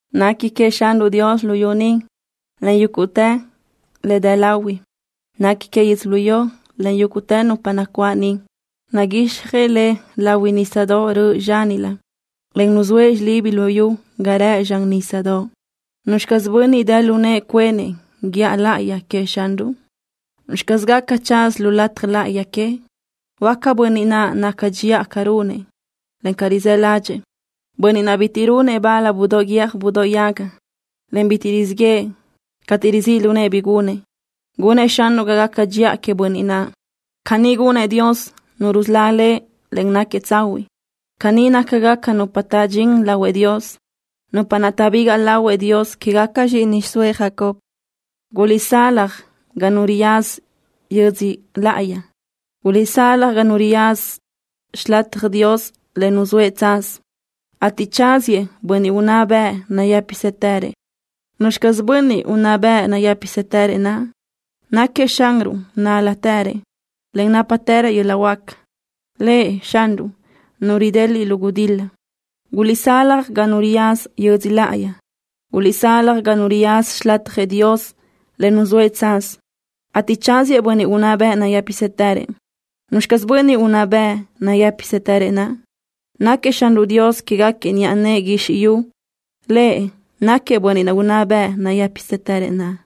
Nequi queëʼ Xanruʼ Dios luyú ni, en yúguʼtë le dë lahui. Nequi queëʼ yödzölió, en yúguʼtë nupa nacuáʼ niʼ. Naguixjëʼ le lahui nísadoʼ röʼö zxánilö, en nuzóëʼ xilibi luyú ga rëʼ zxan nísadoʼ. ¿Nuzxi caz bönniʼ dë lu nëʼë cuenëʼ guíʼa láʼayi queëʼ Xanruʼ? ¿Nuzxi caz gaca tsaza lu lataj láʼayi queëʼ? Huáca bönniʼ naʼ naca dxiʼa ca runëʼ, en ca rizáʼ ládxëʼë, bönniʼ naʼ bitiʼ runëʼ bal budóʼ guiö́j budóʼ yaga, en bitiʼ rizíʼ yëʼë cateʼ rizíʼ lu nëʼë bi gunëʼ. Gunëʼ Xanruʼ ga gaca dxiʼa queëʼ bönniʼ naʼ. Caní gunnë́ʼ Dios, Nu rusölá lëʼ, en náquiëʼ tsahuiʼ. Caní nácagaca nupa taʼdxín lahuëʼ Dios, nupa naʼ taʼbigaʼ lahuëʼ Dios quégaca zxíʼini xiʼsóëʼ Jacob. Guliʼsalaj ga nu riyaza yödzö laʼayi. Guliʼsalaj ga nu riyaza xilatjëʼ Dios le nuzóëʼ tsaz, ateʼ tsáziëʼ Bönniʼ unná bëʼ nayë́pisëtërëʼ. ¿Nuzxi caz Bönniʼ unná bëʼ nayë́pisëtërëʼ naʼ? Náquiëʼ Xanruʼ nál-latërëʼ, en nápatërëʼ yöl-laʼ huáca, Lëʼ, Xanruʼ, Nu rideliʼ lu gudil-la. Guliʼsalaj ga nu riyaza yödzö laʼayi. Guliʼsalaj ga nu riyaza xilatjëʼ Dios le nuzóëʼ tsaz, ateʼ tsáziëʼ Bönniʼ unná bëʼ nayë́pisëtërëʼ. ¿Nuzxi caz Bönniʼ unná bëʼ nayë́pisëtërëʼ naʼ? Náquiëʼ Xanruʼ Dios quéguequi niʼa nëʼë guizxi yu. Lëʼ náquiëʼ Bönniʼ unná bëʼ nayë́pisëtërëʼ naʼ.